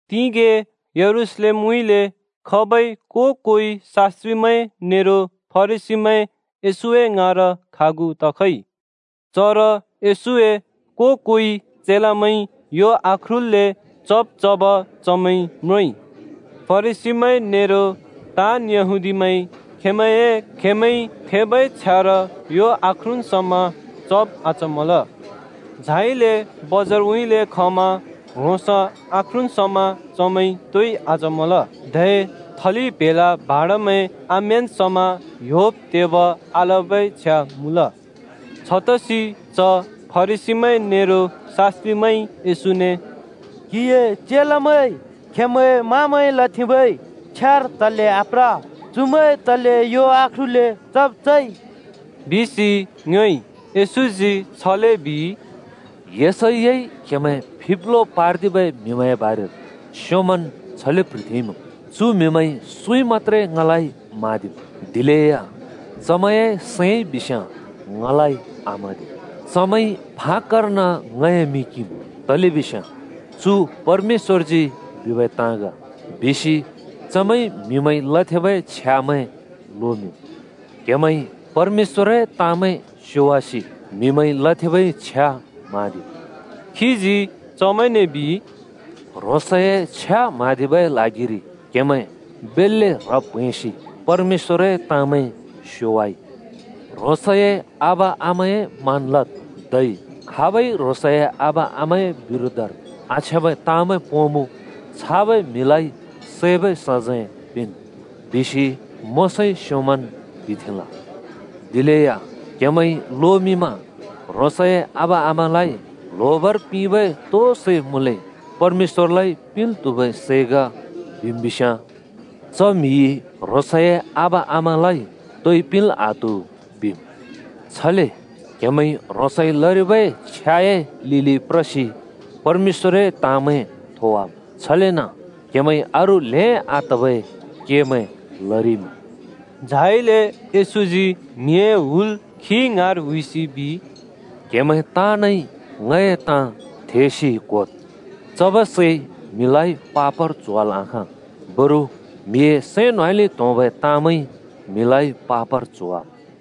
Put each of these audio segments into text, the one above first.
तिगें यरूशलेमउँइँले खबै को-कोइ शास्‍त्रिमैं नेरो फरिसीमैं येशूए ङाँर खागु तखइ। चर येशूए को-कोइ चेलामैंइ यो आख्रुल्‍ले चब् चब चमैंइ म्रोंइ। (फरिसीमैं नेरो ताँन् यहूदीमैंइ खेंमैंए खेमैंइ थेंबै छ्यार यो आख्रुन् समा चब् आचमल। झाइले बजारउँइँले खमा ह्रोंस आख्रुन् समा चमैंइ तोइ आचमल। धै थलि प्‍हेला भाँडमैं आम्‍यान् समा ह्‍योब् तेब आलबै छ्या मुँल। छतसि च फरिसीमैं नेरो शास्‍त्रिमैंइ “क्‍हिए चेलामैंइ खेमैं-मामैंइ लथेंबै छ्यार तले आप्र? चुमैंइ तले यो आख्रुल्‍ले चब् चइ?” बिसि येशूने ङ्योएइ। येशूजी छले बिइ, “क्हेमैं फिब्लो पार्दिबै म्‍हिमैंए बारेर येशैयाइ स्‍योंमन् छले प्ह्रिथेंइमुँ, ‘चु म्हिमैंइ सुँइ मत्‍त्रे ङलाइ म्हाँदिम्, दिलेया चमैंए सैंइ बिस्‍याँ ङलाइ आम्हाँदि। चमैंइ फाक्‍कर्न ङए मिं किंम्, तलेबिस्याँ “चु परमेश्‍वरजी बिबै ताँ ग,” बिसि म्हिमैंइ लथेंबै छ्यामैं चमैंइ लोमिंम्।’ क्हेमैंइ परमेश्‍वरए ताँमैं स्योवासि म्हिमैंइ लथेंबै छ्या म्हाँदिम्।” खीजी चमैंने बिइ, “ह्रोंसए छ्या म्हाँदिबै ल्हागिरि क्हेमैं बेल्‍ले ह्रब् प्हैंसि परमेश्‍वरए ताँमैं स्योवाइ। ‘ह्रोंसए आबा-आमाए मान लद्।’ धै ‘खाब‍इ ह्रोंसए आबा आमाए बिरोधर आछ्याँबै ताँमैं पोंमुँ छाबै म्हिलाइ सैबै सजैं पिंन्,’ बिसि मोशाइ स्योंमन् बिथेंल। दिलेया क्‍हेमैंइ लोमिंमा: ‘ह्रोंसए आबा आमालाइ ल्होबर पिंबै तो मुँले सै परमेश्‍वरलाइ पिंल् त्हुबै सै ग।’ बिम् बिस्‍याँ, ‘च म्‍हिइ ह्रोंसए आबा आमालाइ तोइ पिंल् आत्हु’ बिम्। छले ह्रोंसइ लरिबै छ्याए लिलि प्रसि क्‍हेमैंइ परमेश्‍वरए ताँमैं थोवाम्। छलेन क्‍हेमैंइ अरू ल्‍हें आतबै केमैं लरिइमुँ।” झाइले येशूजी म्हिए हुल खी ङाँर हुइसि बिइ, “क्‍हेमैं ताँनइ ङए ताँ थेसि क्‍होद्। चबै सैइ म्हिलाइ पापर च्होवाल् आखाँ, बरु म्‍हिए सैं न्‍होंउँइँले त्‍होंबै ताँमैंइ म्हिलाइ पापर च्होवाम्।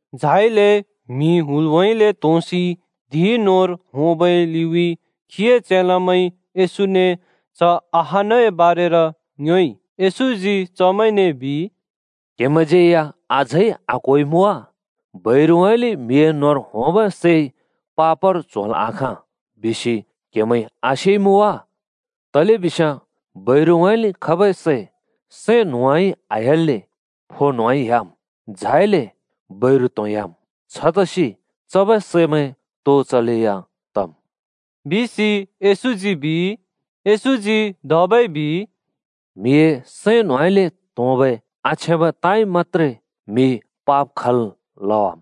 झाइले म्हि हुलउँइँले त्‍होंसि धिं न्‍होंर होंबै लिउँइँ खीए चेलामैंइ येशूने च अहानए बारेर ङ्योएइ। येशूजी चमैंने बिइ, “क्‍हेमैंज्यै या अझै आक्‍होइमुँ वा? सुँउँइँले म्‍हिए फो न्‍होंर होंबै सैइ पापर च्होल् आखाँ बिसि क्हेमैइ आसेइमुँ वा? तलेबिस्याँ सुँउँइँले चबै सै सैं न्‍होंउँइँ आह्‍याल्‍ले फो न्‍होंउँइँ ह्‍याम्, झाइले बैरु त्‍होंह्‍याम्। छतसि चबै समैं तो चलेया तम्!” बिसि येशूजी बिइ। येशूजी धबै बिइ, “म्हिए सैं न्होंउँइँले त्होंबै आछ्याँबै ताँइ मत्‍त्रे म्‍हि पाप खल् लवाम्।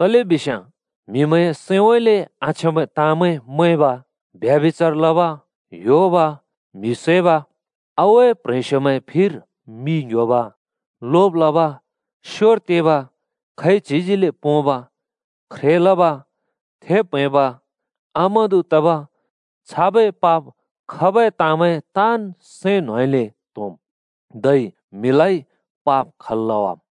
तलेबिस्याँ म्हिमैंए सैंउँइँले आछ्याँबै ताँमैं मैंब, ब्यभिचार लब, ह्‍योब, म्‍हि सैब, रण्डिबाजी लब, लोब लब, स्‍योर तेब, खैच्हिजिले पोंब, ख्रे लब, थेब् प्‍हैंब, आमादु तब, छाबै पाप खबै ताँमैं ताँन् सैं न्‍होंउँइँले त्‍होंम्, धै म्हिलाइ पाप खल् लवाम्।”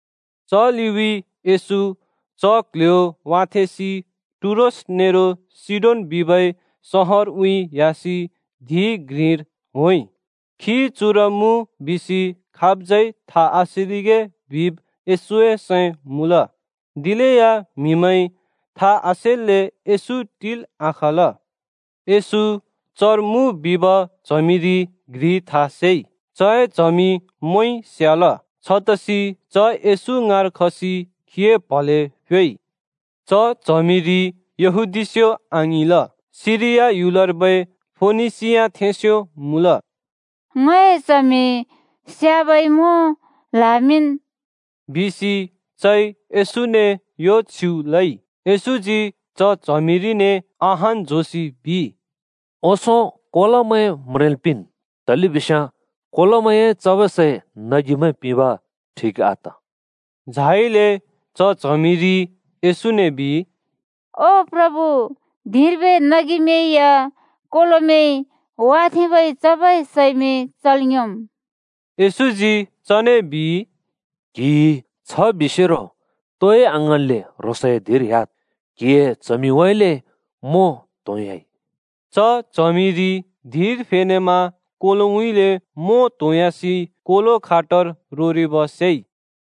च लिउँइँ येशू च क्‍ल्‍ह्‍यो वाथेंसि टुरोस नेरो सीडोन बिबै सहरउँइँ ह्‍यासि धिं घ्रिर होंइ। खी चर मुँ बिसि खाबज्‍यै था आसेरिगे बिब् येशूए सैं मुँल। दिलेया म्‍हिमैंइ था आसेल्‍ले येशू टिल् आखाँल। येशू चर मुँ बिब च्हमिरि घ्रिइ था सेइ। चए च्हमि मोंइ स्‍याल। छतसि च येशू ङाँर खसि खीए प्‍हले फ्‍योइ। च च्हमिरि यहूदीस्यो आङिंल, सिरिया ह्‍युलर्बै फोनिसियाथेंस्यो मुँल। “ङए च्हमि स्याबै मों ल्हामिंन्,” बिसि चइ येशूने यो छ्युँ लइ। येशूजी च च्हमिरिने अहान् झोंसि बिइ, “ओंसों कोलोमैं म्रेंल् पिंन्, तलेबिस्याँ कोलोमैंए चबै सै नगिमैं पिंब ठिक आत।” झाइले च च्हमिरिइ येशूने बिइ, “ओ प्रभु, धिंर्बै नगिमैं या कोलोमैंइ वाथेंबै चबै सैमैं चल् योंम्।” येशूजी चने बिइ, “क्हिइ छ बिसेरो तोइ आङ्हाँन्ले ह्रोंसए धिंर ह्‍याद्। क्‍हिए च्हमिउँइँले मों त्‍होंह्‍याइ।” च च्हमिरि धिंर फेनेमा कोलोउँइँले मों त्होंयासि कोलो खाटर रोरिब स्याइ।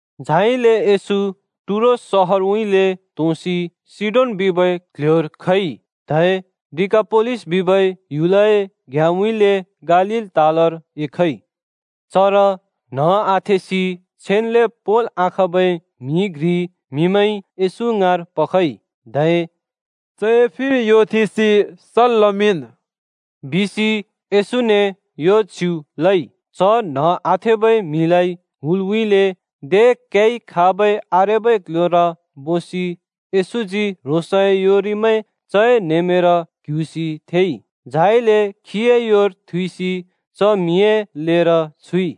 झाइले येशू टुरोस सहरउँइँले त्‍होंसि सीडोन बिबै क्‍ल्‍ह्‍योर खइ। धै डिकापोलिस बिबै ह्‍युलए घ्‍याँउँइँले गालील तालर एखइ। चर न्‍ह आथेसि छेन्‍ले पोंल् आखाँबै म्‍हि घ्रि म्‍हिमैंइ येशू ङाँर पखइ, धै “चए फिर यो थेंसि सल् लमिंन्,” बिसि येशूने यो छ्युँ लइ। च न्ह आथेबै म्‍हिलाइ हुलउँइँले दे क्याइ खाबै आरेबै क्‍ल्‍ह्‍योर बोसि येशूजी ह्रोंसए योरिमैं चए न्‍हेमेंर क्ह्‍युसि थेंइ, झाइले खीए योर थुइसि च म्‍हिए लेर छुइ।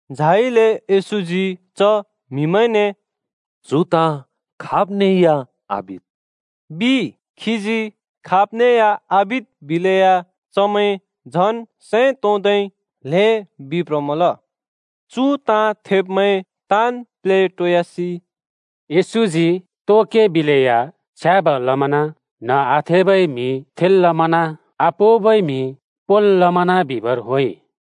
झाइले येशूजी च म्‍हिमैंने, “चु ताँ खाब्ने या आबिद्!” बिइ। खीजी खाब्ने या आबिद् बिलेया, चमैं झन् सैं तोंदै ल्‍हें बिप्रमल। चु ताँ थेब्मैं ताँन् प्लेटोयासि “येशूजी तो के बिलेया छ्याँब लमना। न्‍ह आथेबै म्‍हि थेल् लमना, आपोंबै म्‍हि पोंल् लमना बिबर होंइ।”